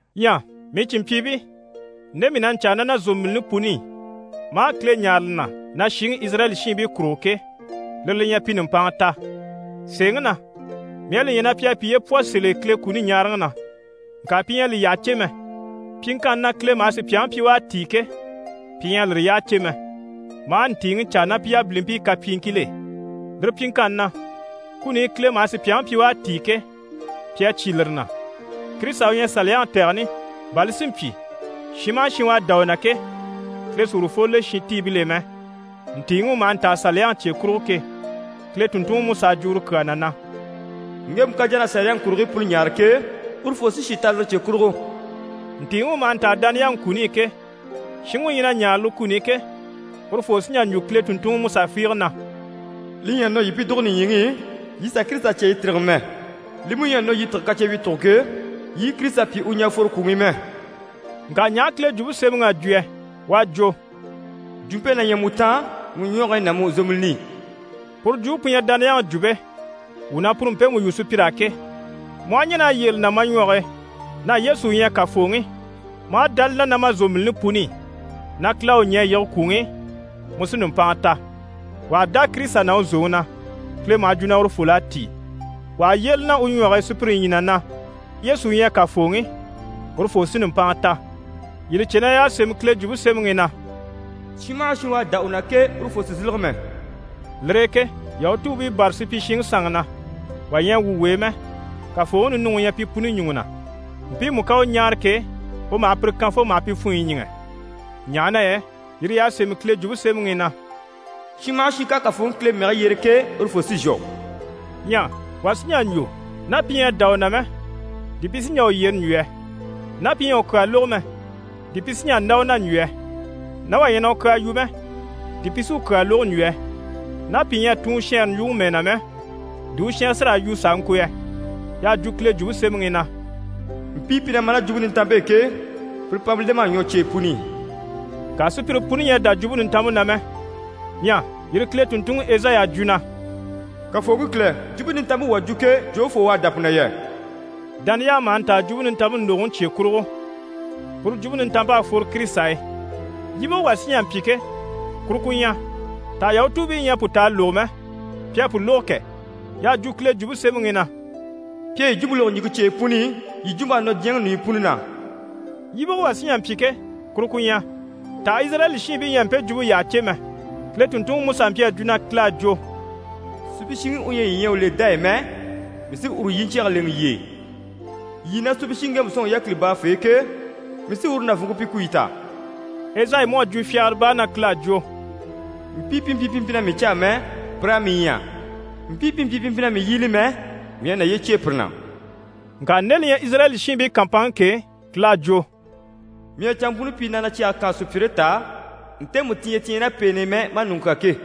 Ɲyɛ mii cìnmpyiibii, nde mii na ɲcaa ná na zòmbilini puni i, maa Kile ɲáare li na na shiŋi Izirayɛli shiinbii kurugo ke, lire li ɲyɛ, pi nùmpanŋa ta. Sèeŋi na, mii à li ɲya na pi à piye pwɔ sèl'e Kile kuni ɲaaraŋi na, ŋka pi ɲyɛ a li yyaha cè mɛ. Pyiŋkanni na Kile maha sùpyaŋi pyi na u à tíi ke, pi ɲyɛ a lire yyaha cè mɛ, maa ntìiŋi caa ná pi yabilimpii kapyiiŋkil'e. Lire pyiŋkanni na, kuni i Kile maha sùpyaŋi pyi u à tíi ke, pi à cyé lire na. Kirisita u ɲyɛ Saliyaŋi tɛgɛni, bà li si mpyi, shin maha shin u à dá u na ke, Kile sí urufoo le shintiibil'e mɛ. Ntìiŋi u maha ntaa Saliyaŋi cye kurugo ke, Kile tùnntunŋiMusa à jwo uru kyaa na na: «Ŋgemu ká jà na Saliyaŋi kurigii puni ɲaare ke, urufoo sí shì ta lire cye kurugo.» Ntìiŋi u maha ntaa dániyaŋi kuni i ke, shinŋi u ɲyɛ na ɲáare lire kuni i ke, urufoo sí n‑jà n‑jwo Kile tùnntunŋi Musa fiige na: «Li ɲyɛ a nɔ yii pi dùgo nìɲyiŋi i (yii sà Kirisita cya yii tîrige mɛ.) Li mú ɲyɛ a nɔ yii tîge kacyewyicuguŋke e (yii i Kirisita pyi u ɲɛ̀ a fworo kwùŋi i mɛ.)» Ŋka ɲaha Kile Jwumpe Semɛŋi à jwo yɛ? U à jwo: «Jwumpe na ɲyɛ mu taan, mu ɲwɔge e ná mu zòmbilini i.» Puru jwumpe pu ɲyɛ dániyaŋi jwumpe, wuu na puru mpemu yu sùpyir'á ke. Mu aha ɲɛn'a yyére li na ma ɲwɔge e na Yesu u ɲyɛ Kafooŋi, maa dá li na ná ma zòmbilini puni i na Kile à u ɲɛ̀ a yige kwùŋi i, mu sí nùmpanŋa ta. Wà ha dá Kirisita na u zòŋi na, Kile maha jwo na urufol'à tíi. Wà ha yyére li na u ɲwɔge e sùpyire ɲyii na na Yesu u ɲyɛ Kafooŋi, urufoo sí nùmpanŋa ta. Yii li cè na y'à sémɛ Kile Jwumpe Semɛŋi i na: «Shin maha shin u à dá u na ke, urufoo sì n‑sílege mɛ.» Lire e ke Yahutuubii bâra supyishiŋi sanŋi na, wà ɲyɛ a wwû w'e mɛ. Kafooŋi ninuŋi u ɲyɛ pi puni ɲùŋɔ na. Mpiimu ká u ɲáare ke, u maha pire kan fo maha pi funɲyi ɲíŋɛ. Ɲaha na yɛ yire y'à sémɛ Kile Jwumpe Semɛŋi i na: «Shin maha shin ká Kafooŋi Kile mɛge yyere ke, urufoo sí n‑shwɔ.» Ɲyɛ wà sí n‑jà n‑jwo, ná pi ɲyɛ a dá u na mɛ, di pi sí n‑jà u yyere n‑jwo yɛ? Ná pi ɲyɛ a u kyaa lógo mɛ, di pi sí n‑jà n‑dá u na n‑jwo yɛ? Ná wà ɲyɛ na u kyaa yu mɛ, di pi sí u kyaa lógo n‑jwo yɛ? Ná pìi ɲyɛ a tun u shɛɛnre ɲjwuŋi mɛɛ na mɛ, di u shɛnrɛ sí raa yu s'a ŋko yɛ? Y'à jwo Kile Jwumpe Semɛŋi i na: «Mpii pi na ma ná Jwumpe Nintanmpe e ke, pire pama lem'à ɲwɔ cyeyi puni i.» Ŋka sùpyire puni ɲyɛ a dá Jwumpe Nintanmpe na mɛ. Ɲyɛ yire Kile tùnntunŋi Ezayi à jwo na: «Kafooŋi Kile, Jwumpe Nintanmpe wuu à jwo ke, jofoo u à dá pu na yɛ?» Dániyaŋi maha ntaa Jwumpe Nintanmpe ndògoŋi cye kurugo, puru Jwumpe Nintanmpe à fworo Kirisita e. Yíbige wà sí n‑jà n‑pyi ke, kuru ku ɲyɛ: «Taha Yahutuubii ɲyɛ a pu ta a lógo mɛ?» Pi à pu lógo kɛ! Y'à jwo Kile Jwumpe Semɛŋi i na: «Pi à yi jwumpe lógo ɲìŋke cyeyi puni i, yi jwump'à nɔ diɲyɛŋi ɲùɲyi puni na.» Yíbige wà saha sí n‑jà n‑pyi ke, kuru ku ɲyɛ: «Taha Izirayɛli shiinbii ɲyɛ a mpe jwumpe yyaha cè mɛ?» Kile tùnntunŋiMusa mpyi a jwo na Kile à jwo: «Supyishiŋi u ɲyɛ yii ɲyɛ a u le dá e mɛ, mii sí uru yiɲcyɛge lèŋɛ yii e, yii na supyishiŋi ŋgemu sɔ̂nŋi yákili baafee ke, mii sí uru nàvunŋke pyi ku yii ta.» Ezayi mú à jwo fyagara baa na Kile à jwo: «Mpii pi mpyi pi mpyi na mii caa mɛ, pir'à mii ɲya, mpii pi mpyi pi mpyi na mii yíbili mɛ, mii à naye cyêe pire na.» Ŋka nde li ɲyɛ Izirayɛli shiinbii kàmpanŋke ke, Kile à jwo: «Mii à canmpuni pyi na na cyɛge kaan sùpyire t'á, ntemu ti ɲyɛ ti ɲyɛ ná pèen'i mɛ, maa ɲùŋɔ kyán ke.»